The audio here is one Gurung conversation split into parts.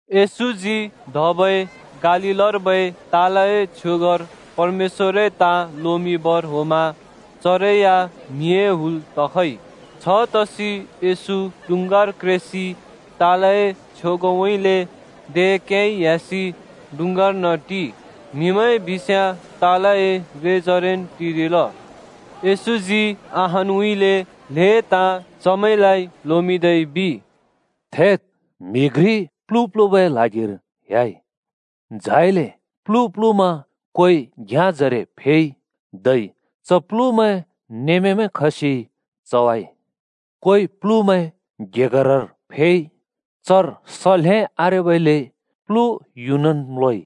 येशूजी धबै गालीलर्बै तालए छ्योगर परमेश्‍वरए ताँ लोमिंबर होंमा चरै या म्हिए हुल तखइ। छतसि येशू डुँङ्गार क्रेसि तालए छ्योगउँइँले दे क्याइ ह्‍यासि डुँङ्गारर्न टिइ। म्हिमैं बिस्याँ तालए रेजरेन् टिरिल। येशूजी अहानउँइँले ल्‍हें ताँ चमैंलाइ लोमिंदै बिइ, “थेद्, म्‍हि घ्रि प्‍लु प्‍लुबै ल्हागिर ह्‍याइ। झाइले प्‍लु प्‍लुमा कोइ घ्‍याँजरे फेइ, धै च प्‍लुमैं नेमेमैं खसि चवाइ। कोइ प्‍लुमैं गेगरर फेइ। चर स ल्‍हें आरेबइले प्लु युनन् म्‍लोइ।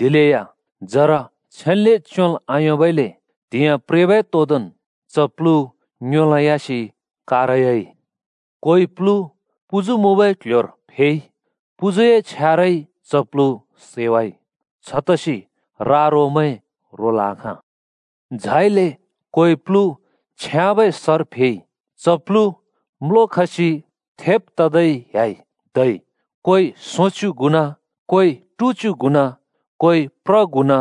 दिलेया जरा छेन्ले च्‍योंल् आयोंबइले त्‍हिंयाँ प्रेबै तोंदोंन् च प्लु ङ्योंलोंयासि कारयाइ। कोइ प्‍लु पुजु मुँबै क्‍ल्‍ह्‍योर फेइ। पुजुए छ्यारइ च प्लु सैवाइ। छतसि रा-रोमैं रोल् आखाँ। झाइले कोइ प्‍लु छ्याँबै सर फेइ। च प्‍लु म्‍लोखसि थेब ततै ह्‍याइ। धै कोइ सोंच्‍यु गुणा, कोइ टुच्‍यु गुणा, कोइ प्र गुणा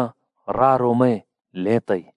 रा-रोमैं ल्हें तइ।”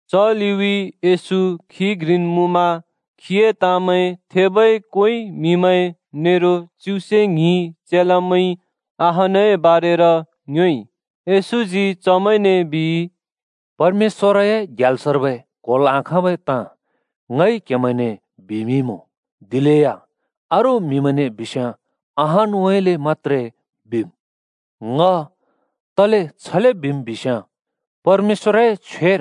च लिउँइँ येशू खी घ्रिन् मुँमा खीए ताँमैं थेबै कोइ म्‍हिमैं नेरो च्युसे ङ्हि चेलामैंइ अहानए बारेर ङ्योएइ। येशूजी चमैंने बिइ, “परमेश्‍वरए ग्याल्सर्बै क्होल् आखाँबै ताँ ङइ क्‍हेमैंने बिमिंइमुँ, दिलेया अरू म्हिमैंने बिस्‍याँ अहानउँइँले मत्‍त्रे बिम्। ङ तले छले बिम् बिस्याँ, परमेश्‍वरए छ्वेर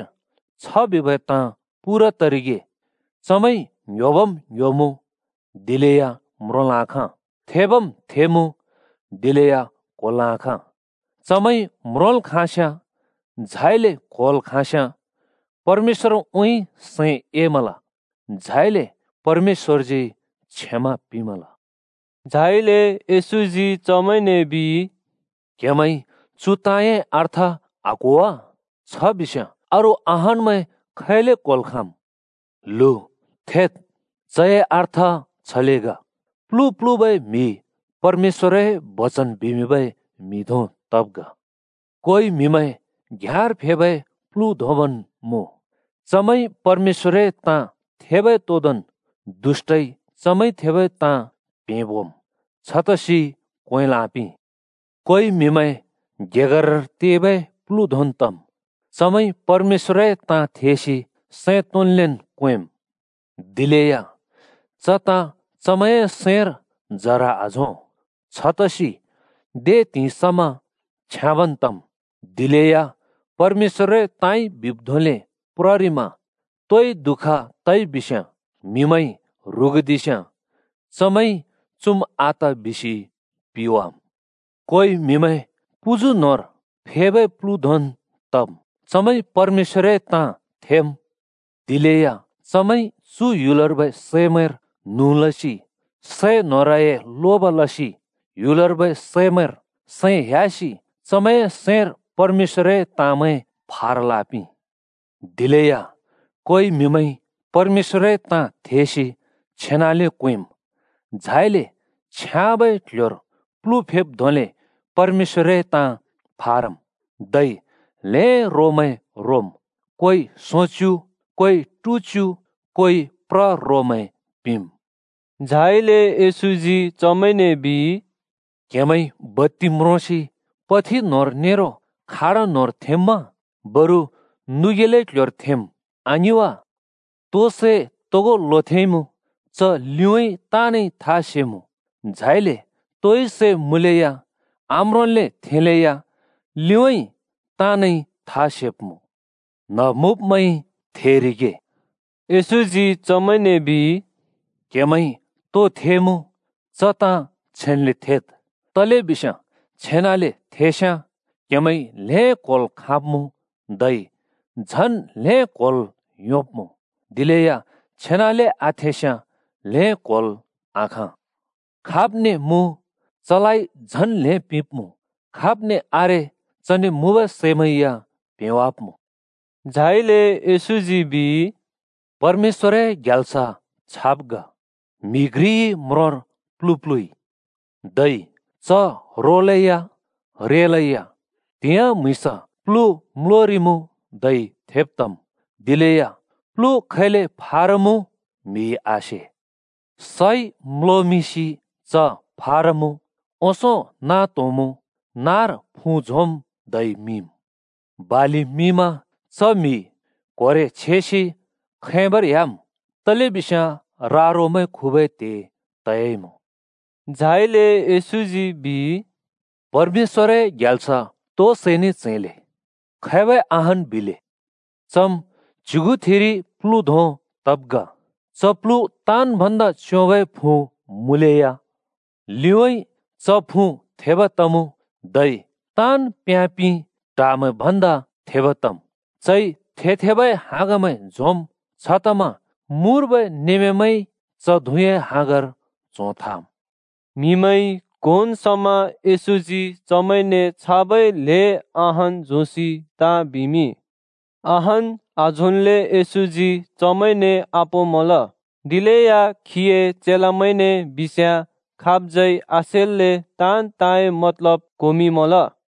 छ बिबै ताँ पूरा तरिगे: ‘चमैंइ ङ्‌ह्‍योबम् ङ्‌ह्‍योमुँ, दिलेया म्रोंल् आखाँ, थेबम् थेमुँ, दिलेया क्‍होल् आखाँ। चमैंइ म्रोंल् खाँस्‍याँ, झाइले क्‍होल् खाँस्‍याँ, परमेश्‍वरउँइँ सैं एमल, झाइले परमेश्‍वरजी क्षमा पिंमल।’” झाइले येशूजी चमैंने बिइ, “क्‍हेमैंइ चु ताँए अर्थ आक्‍हो वा? छ बिस्‍याँ अरू अहानमैं खैले क्‍होल् खाँम्? ल्हु, थेद्, चए अर्थ छले ग: प्‍लु प्‍लुबै म्‍हि परमेश्‍वरए बचन बिमिंबै म्‍हि धों तब् ग। कोइ म्‍हिमैं घ्याँर फेबै प्लु धोंबन् मुँ। चमैंइ परमेश्‍वरए ताँ थेबै तोदोंन् दुष्‍टइ चमैंइ थेबै ताँ प्‍हेंबोम्। छतसि क्‍वेंल् आपिं। कोइ म्‍हिमैं गेगरर तेबै प्‍लु धोंन् तम्। चमैंइ परमेश्‍वरए ताँ थेसि सैं तोंन्लेन् क्‍वेंम्, दिलेया च ताँ चमैंए सैंर जरा आझों। छतसि दे त्हिंइ समा छ्याँबन् तमुँ, दिलेया परमेश्‍वरए ताँइ बिब् धोंले प्ररिमा तोइ दुःख तइबिस्‍याँ, म्‍हिमैंइ ह्रुगुदिस्‍याँ, चमैंइ ‘चुम् आत’ बिसि पिवाम्। कोइ म्‍हिमैं पुजु न्‍होंर फेबै प्लु धोंन् तम्। चमैंइ परमेश्‍वरए ताँ थेम्, दिलेया चमैंइ चु ह्‍युलर्बै सैमैंर न्हुँ लसि, सैन्होरए (सम्‍पत्तिए) लोब लसि, ह्‍युलर्बै सैमैंर सैं ह्‍यासि चमैंए सैंर परमेश्‍वरए ताँमैं फारल् आपिं। दिलेया कोइ म्‍हिमैंइ परमेश्‍वरए ताँ थेसि छेनले क्‍वेंम्, झाइले छ्याँबै क्‍ल्‍ह्‍योर प्‍लु फेब् धोंले परमेश्‍वरए ताँ फारम्। धै ल्‍हें रोमैं रोम् कोइ सोंच्‍यु, कोइ टुच्‍यु, कोइ प्र रोमैं पिंम्।” झाइले येशूजी चमैंने बिइ, “क्‍हेमैंइ बत्ति म्रोसि पथि न्‍होंर नेरो खाट न्होंर थेंम्‍मा? बरु नुबै क्‍ल्‍ह्‍योर थेंम्, आङिं वा? तो सै तोगो लोथेंइमुँ, च लिउँइँ ताँनइ था सेमुँ, झाइले तोइ सै मुँलेया आम्रोंल्‍ले थेंलेया लिउँइँ ताँनइ था सेब्मुँ। न्ह मुँब्मैंइ थेरिगे।” येशूजी चमैंने बिइ, “क्‍हेमैंइ तो थेमुँ, च ताँ छेन्‍ले थेद्: तलेबिस्याँ छेनाले थेस्याँ क्‍हेमैंइ ल्हें क्होल् खाँब्मुँ धै झन् ल्हें क्होल् योंब्मुँ। दिलेया छेनाले आथेस्याँ ल्हें क्होल् आखाँ। खाब्ने मुँ चलाइ झन् ल्‍हें पिंब्‍मुँ, खाब्ने आरे चने मुँबै सैमैं या प्‍हेंवाब्‍मुँ।” झाइले येशूजी बिइ, “परमेश्‍वरए ग्याल्स छाब् ग: म्‍हि घ्रिइ म्रोंर प्‍लु प्‍लुइ। धै च रोलैया, रेलैया त्हिंयाँ म्‍हुँइँसा प्लु म्‍लोरिमुँ धै थेब तम्। दिलेया प्‍लु खैले फारमुँ म्‍हिइ आसे। सइ म्‍लोमिंसि च फारमुँ। ओंसों नाँ त्होंमुँ, नाँर फुँ झोंम् धै मिंम्। बालि मिंमा च म्‍हि कोरे (आँसि) छेसि खैंबर ह्‍याम् तलेबिस्याँ रा-रोमैं खुबै त्हे तइमुँ।” झाइले येशूजी बिइ, “परमेश्‍वरए ग्याल्स तो सैने च्‍हैंले? खैबै अहान् बिले? चम् च्युगुथिरि प्लु धों तब् ग। च प्‍लु ताँन् भन्दा च्‍योंबै फुँ मुँलेया लिउँइँ च फुँ थेब तमुँ, धै ताँन् प्याँ-पिं ट्हामैं भन्दा थेब तम्, चइ थे-थेबै हाँगमैं झोंम्। छतमा मुर्बै नेमेमैंइ च धुँए हाँगर च्हों थाम्।” म्‍हिमैंइ क्‍होन् समा येशूजी चमैंने छाबै ल्‍हें अहान् झोंसि ताँ बिमिंइ। अहान् आझोंन्ले येशूजी चमैंने आपोंमल, दिलेया खीए चेलामैंने बिस्‍याँ खाबज्यै आसेल्‍ले ताँन् ताँए मतलब क्होमिंमल।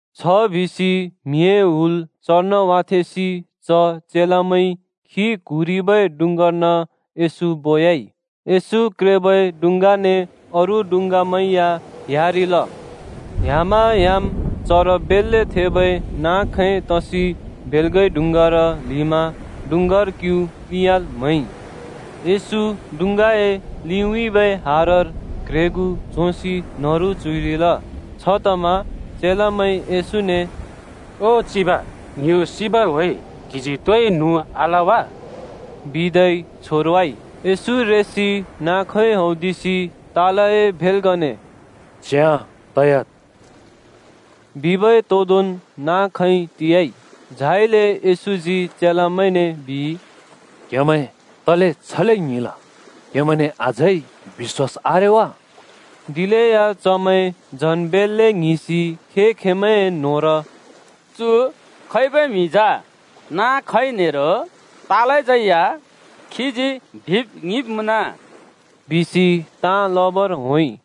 छबिसि म्हिए हुल चर्न वाथेंसि च चेलामैंइ खी क्हुँरिबै डुँङ्गार्न येशू बोयाइ। येशू क्रेबै डुँङ्गाने अरू डुँङ्गामैं या ह्‍यारिल। ह्‍यामा ह्‍याम् चर बेल्‍ले थेबै नाँ-खैं तसि भेल्गइ डुँङ्गार ल्हिमा डुँङ्गार क्यु प्‍लिंयाल् म्‍हैइ। येशू डुँङ्गाए लिउँइँ हार क्रेगुँ झोंसि न्‍हरु च्‍हुइरिल। छतमा चेलामैंइ येशूने “ओ चिब, ङ्यो सिबर होंइ क्‍हिजी तोइ न्हुँ आल वा?” बिदै छोरवाइ। येशू रेसि नाँ-खैं हौदिसि तालए भेल्‍गने “च्याँ तयाद्!” बिबै तोदोंन् नाँ-खैं टियाइ। झाइले येशूजी चेलामैंने बिइ, “क्‍हेमैं तले छले ङ्हिंल? क्‍हेमैंने अझै बिश्‍वास आरे वा?” दिलेया चमैं झन् बेल्‍ले ङ्हिंसि खें-खेंमैंए न्होंर “चु खैबै म्‍हि जा? नाँ-खैं नेरो तालज्यै या खीजी बिब् ङिंब् मुँन,” बिसि ताँ लबर होंइ।